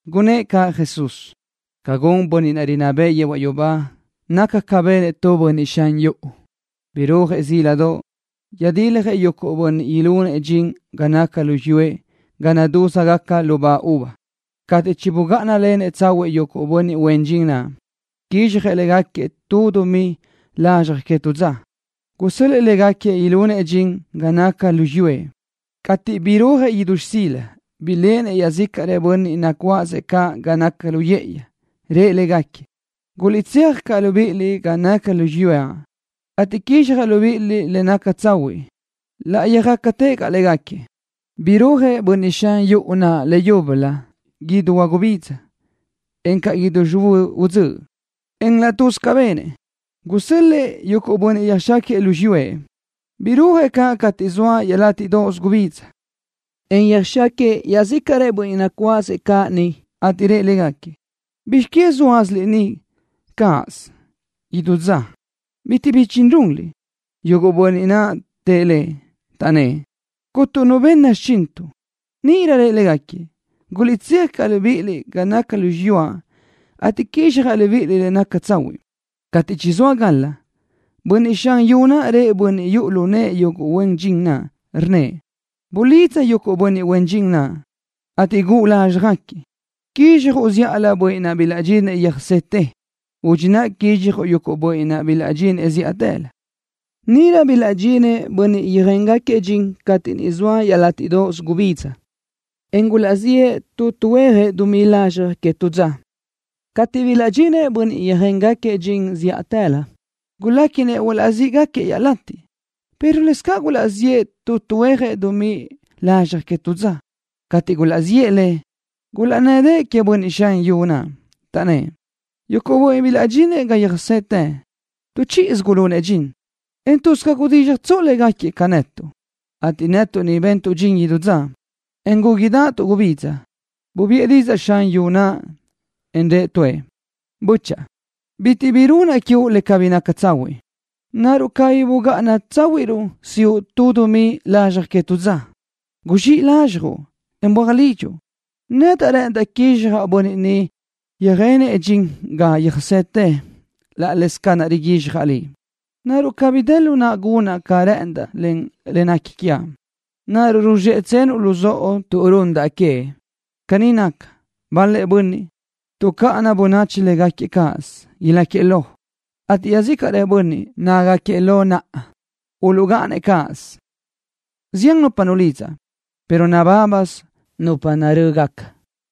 Gunnë́ʼ caʼ Jesús: —Ca gun Bönniʼ naʼ rinná bëʼë yehuaʼ yubá naca ca benëʼ tu bönniʼ xan yuʼu. Birúajëʼ zíladoʼ, yöjdiljëʼ yuguʼ bönniʼ ilunëʼ dxin ga naca lu xiyúëʼ ga naʼ nadúzgaca lubá uva. Cateʼ chibugáʼanalenëʼ tsahuiʼ yuguʼ bönniʼ huen dxin naʼ, quizxjëʼ légaquiëʼ tu dumí lazxaj que tu dza, gusö́l-lëʼë légaquiëʼ ilunëʼ dxin ga naca lu xiyúëʼ. Cateʼ burúajëʼ idú xsila, biléʼenëʼ iaʼzícaʼrëʼ bönniʼ nacuáʼasëʼ caʼ ga naca lu yë́ʼëyi. Rëʼ légaquiëʼ: “Guliʼtséaj caʼ libíʼiliʼ ga naca lu xiyúaʼ, ateʼ quizxjaʼ libíʼiliʼ le naca tsahuiʼ.” Laʼ yöjácatëʼ caʼ légaquiëʼ. Burúajëʼ bönniʼ xan yuʼu naʼ leyúbölö idú huagubidza, encaʼ idú xihuö́ udzö́ʼ, en laʼ tuz ca benëʼ, gusö́l-lëʼë yuguʼ bönniʼ yöjxáquiëʼ lu xiyúëʼ. Burúajëʼ caʼ cateʼ niʼ zoa iaʼlátiʼdoʼos gubidza, en yöjxáquiëʼ iaʼzícaʼrëʼ bönniʼ nacuáʼasëʼ caʼ niʼ, ateʼ rëʼ légaquiëʼ: “¿Bizx que zóatsaliʼ ni cáʼasö idú dza, bitiʼ bi dxin runliʼ?” Yuguʼ bönniʼ naʼ tëʼ lëʼ, taʼnnë́ʼ: “Cuntu nu benna xichintuʼ.” Níʼirö rëʼ légaquiëʼ: “Guliʼtséaj caʼ libíʼiliʼ ga naca lu xiyúaʼ, ateʼ quizxjaʼ libíʼiliʼ le naca tsahuiʼ.” Cateʼ chizóa gal-la, bönniʼ xan yu naʼ rëʼ bönniʼ yuʼu lu nëʼë yuguʼ huen dxin naʼ, rnnëʼ: “Bulidza yuguʼ bönniʼ huen dxin naʼ, ateʼ guʼu lázxjagaquiëʼ. Quizxjuʼ zíʼalö yuguʼ bönniʼ naʼ bilaʼdxinëʼ yöjsetë. Udxi naʼ quizxjuʼ yuguʼ bönniʼ naʼ bilaʼdxinëʼ zíʼatëlö.” Níʼirö bilaʼdxinëʼ bönniʼ yöjéngaquiëʼ dxin cateʼ niʼ zoa iaʼlátiʼdoʼos gubidza, en gulaʼziʼë tu tuhuéajëʼ dumí lazxaj que tu dza. Cateʼ bilaʼdxinëʼ bönniʼ yöjéngaquiëʼ dxin zíʼatëlö, guléquinëʼ huazíʼgaquiëʼ iaʼlatiʼ, pero lëscaʼ gulaʼziʼë tu tuhuéajëʼ dumí lazxaj que tu dza. Cateʼ gulaʼziʼë le, gulaʼnnë́dëʼë queëʼ bönniʼ xan yuʼu naʼ, taʼnnë́ʼ: “Yuguʼ bönniʼ ni bilaʼdxinëʼ ga yöjsetë, tu chíʼisö gulunëʼ dxin, en tuz ca gudízxjatsoʼ légaquiëʼ ca netuʼ, ateʼ netuʼ ni bentuʼ dxin idú dza, en gúguidaʼatuʼ gubidza.” Bubiʼë didzaʼ xan yu naʼ, en rëʼ tuëʼ: “Bö́chaʼa, bitiʼ bi runaʼ quiuʼ le cabí naca tsahuiʼ. ¿Naruʼ cabí bugáʼana tsáhuiʼruʼ siʼu tu dumí lazxaj que tu dza? Guzxíʼ lazxjuʼ, en böaj lidxuʼ. Nedaʼ rë́ʼëndaʼ quizxjaʼ bönniʼ ni yöjenëʼ dxin ga yöjsetë laʼ leze ca naʼ riguizxjaʼ liʼ. ¿Naruʼ cabí dë lu naʼa gunaʼ ca rë́ʼëndaʼ len le nequi quiaʼ? ¿Naruʼ ruzxéʼetsenuʼ-nëʼ luzóʼo tuʼ rúnnadaʼa queëʼ?” Caní naca, bal-lëʼ bönniʼ, tuʼcáʼana bönachi légaquiëʼ cáʼasö, ilácagaquiëʼ lo, ateʼ iaʼzícaʼrëʼ bönniʼ, nácagaquiëʼ lo naʼa, uluʼgáʼanëʼ cáʼasö. Zián nupa nulidzaʼ, pero nabábasö nupa narö́gaca.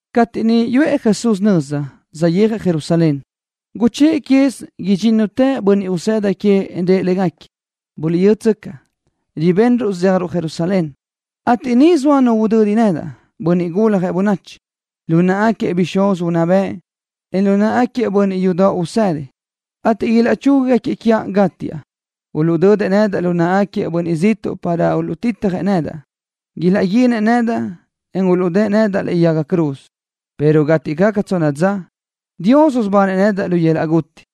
Cateʼ niʼ yuʼë Jesús nöza, saʼyéajëʼ Jerusalén, guchë́ʼë quez idxínnutëʼ bönniʼ usëda queëʼ, en rëʼ légaquiëʼ: —Buliʼyútsöcaʼ, ribenruʼ zéajruʼ Jerusalén, ateʼ niʼ soa nu udödi nedaʼ, Bönniʼ Guljëʼ Bönachi, lu náʼagaquiëʼ bixúz unná bëʼ, en lu náʼagaquiëʼ bönniʼ yudoʼ usëdi, ateʼ ilaʼchúguiëʼ quiaʼ gátiaʼ. Uluʼdödëʼ nedaʼ lu náʼagaquiëʼ bönniʼ ziʼtuʼ para uluʼtitjëʼ nedaʼ. Ilaʼguinëʼ nedaʼ, en uluʼdë́ʼë nedaʼ lëʼe yaga cruz, pero cateʼ gaca tsonna dza, Dios usubanëʼ nedaʼ lu yöl-laʼ guti.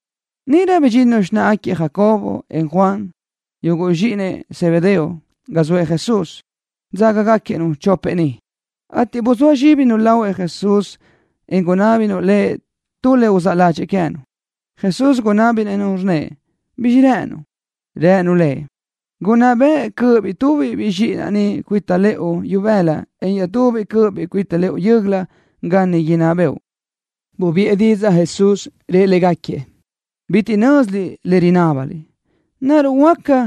Níʼirö bidxinnu xináʼagaquiëʼ Jacobo, en Juan, yuguʼ zxíʼinëʼ Zebedeo, ga zoëʼ Jesús, dzágagaquiëʼ-nu chopëʼ ni, ateʼ buzóa zxíbinu lahuëʼ Jesús, en gunábinu Lëʼ tu le uzáʼ ládxëʼë queë́nu. Jesús gunábinëʼ-nu, rnnëʼ: —¿Bizxi rë́ʼënuʼ? Rënu Lëʼ: —Gunná bëʼ cö́ʼöbiʼ tubiʼ zxíʼinaʼ ni cuita lëʼu ibëla, en iaʼtubiʼ cö́ʼöbiʼ cuita lëʼu yö́göla ga niʼ inná bëʼu. Bubiʼë didzaʼ Jesús, rëʼ légaquiëʼ: —Bitiʼ nö́ziliʼ le rinábaliʼ. ¿Naruʼ huáca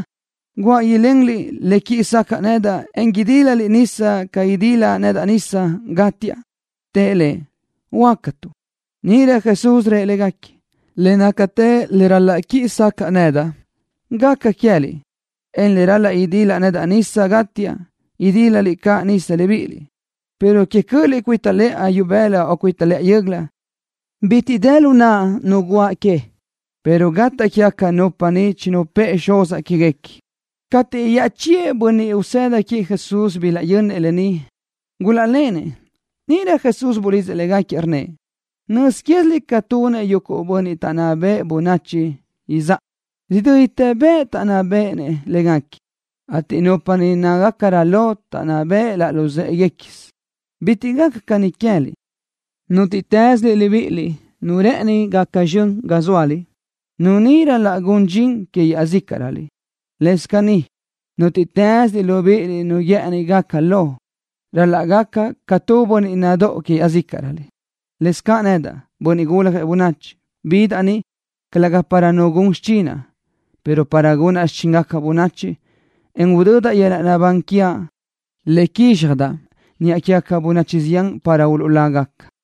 guáʼ ilenliʼ le quiʼi sacaʼ nedaʼ, en idílaliʼ nisa ca idilaʼ nedaʼ nisa, gátiaʼ? Tëʼ Lëʼ: —Huácatuʼ. Níʼirö Jesús rëʼ légaquiëʼ: —Le nácatë le ral-laʼ quiʼi sacaʼa nedaʼ, gaca caʼ queë́liʼ, en le ral-laʼ idilaʼ nedaʼ nisa, gátiaʼ, idílaliʼ caʼ nisa libíʼiliʼ, pero que cö́ʼöliʼ cuita lëʼa ibëla o cuita lëʼa yö́göla, bitiʼ dë lu naʼa nu guʼa que, pero gataʼ quégaca nupa niʼ chinupë́ʼë Xuzaʼ quéguequi. Cateʼ iaʼchíëʼ bönniʼ usëda queëʼ Jesús bilaʼyönnëʼ lë ni, gulaʼlenëʼ. Níʼirö Jesús bulidzëʼ légaquiëʼ, rnnëʼ: —Nözquéziliʼ ca tunëʼ yuguʼ bönniʼ taʼnná béʼenëʼ bönachi izáʼa, ridö́ditë bëʼ taʼnná béʼenëʼ légaquiëʼ, ateʼ nupa niʼ nácagacarö lo taʼnná beʼe laʼ luzë́ʼeguequisö. Bitiʼ gaca caní queë́liʼ. Nútiʼtëslöliʼ libíʼiliʼ nu rë́ʼëni gaca zxön ga zóaliʼ, nu ni ral-laʼ gun dxin que iaʼzícaʼröliʼ. Lëscaʼ caní, nútiʼtëslöliʼ libíʼiliʼ nu guë́ʼëni gaca lo, ral-laʼ gaca ca tu bönniʼ nadóʼo que iaʼzícaʼröliʼ. Lëscaʼ nedaʼ, Bönniʼ Guljëʼ Bönachi, bidaʼ ni, calëga para nu gun xichinaʼ, pero para gunaʼ xichíngaca bönachi, en udödaʼ yöl-laʼ naʼbán quiaʼ, le quízxjadaʼ niʼa quégaca bönachi zián para uluʼlágaca.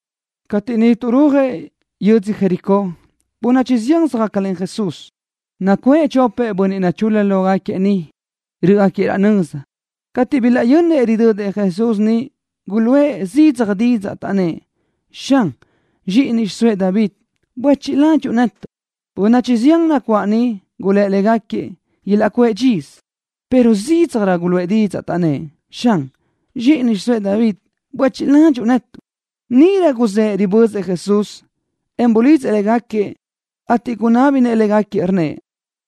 Cateʼ niʼ tuʼrúajëʼ yödzö Jericó, bönachi zián söjácalen Jesús. Nacuʼë chopëʼ bönniʼ nachul-la lógaquiëʼ niʼ, rö́ʼgaquiëʼ raʼ nöza. Cateʼ bilaʼyönnëʼ ridödëʼ Jesús niʼ, guluʼë zidzaj didzaʼ, taʼnnë́ʼ: —Xan, zxíʼini xiʼsóëʼ David, buéchiʼ ladxiʼ netuʼ. Bönachi zián nacuáʼ niʼ gulë́ légaquiëʼ ilaʼcuʼë dxisö, pero zídzajrö guluʼë didzaʼ, taʼnnë́ʼ: —Xan, zxíʼini xiʼsóëʼ David, buéchiʼ ladxiʼ netuʼ. Níʼirö guzë́ʼ ribözëʼ Jesús, en bulidzëʼ légaquiëʼ, ateʼ gunábinëʼ légaquiëʼ, rnnëʼ: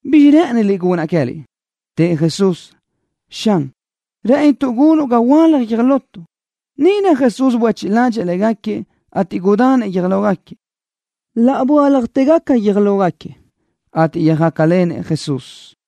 —¿Bizxi rë́ʼëniliʼ gunaʼ queë́liʼ? Tëʼ Jesús: —Xan, rë́ʼënituʼ gunuʼ ga huöálaj guiö́j lotuʼ. Níʼirö Jesús buéchiʼ ládxëʼë légaquiëʼ, ateʼ gudanëʼ guiö́j lógaquiëʼ. Laʼ böáljatëgaca guiö́j lógaquiëʼ, ateʼ yöjácalenëʼ Jesús.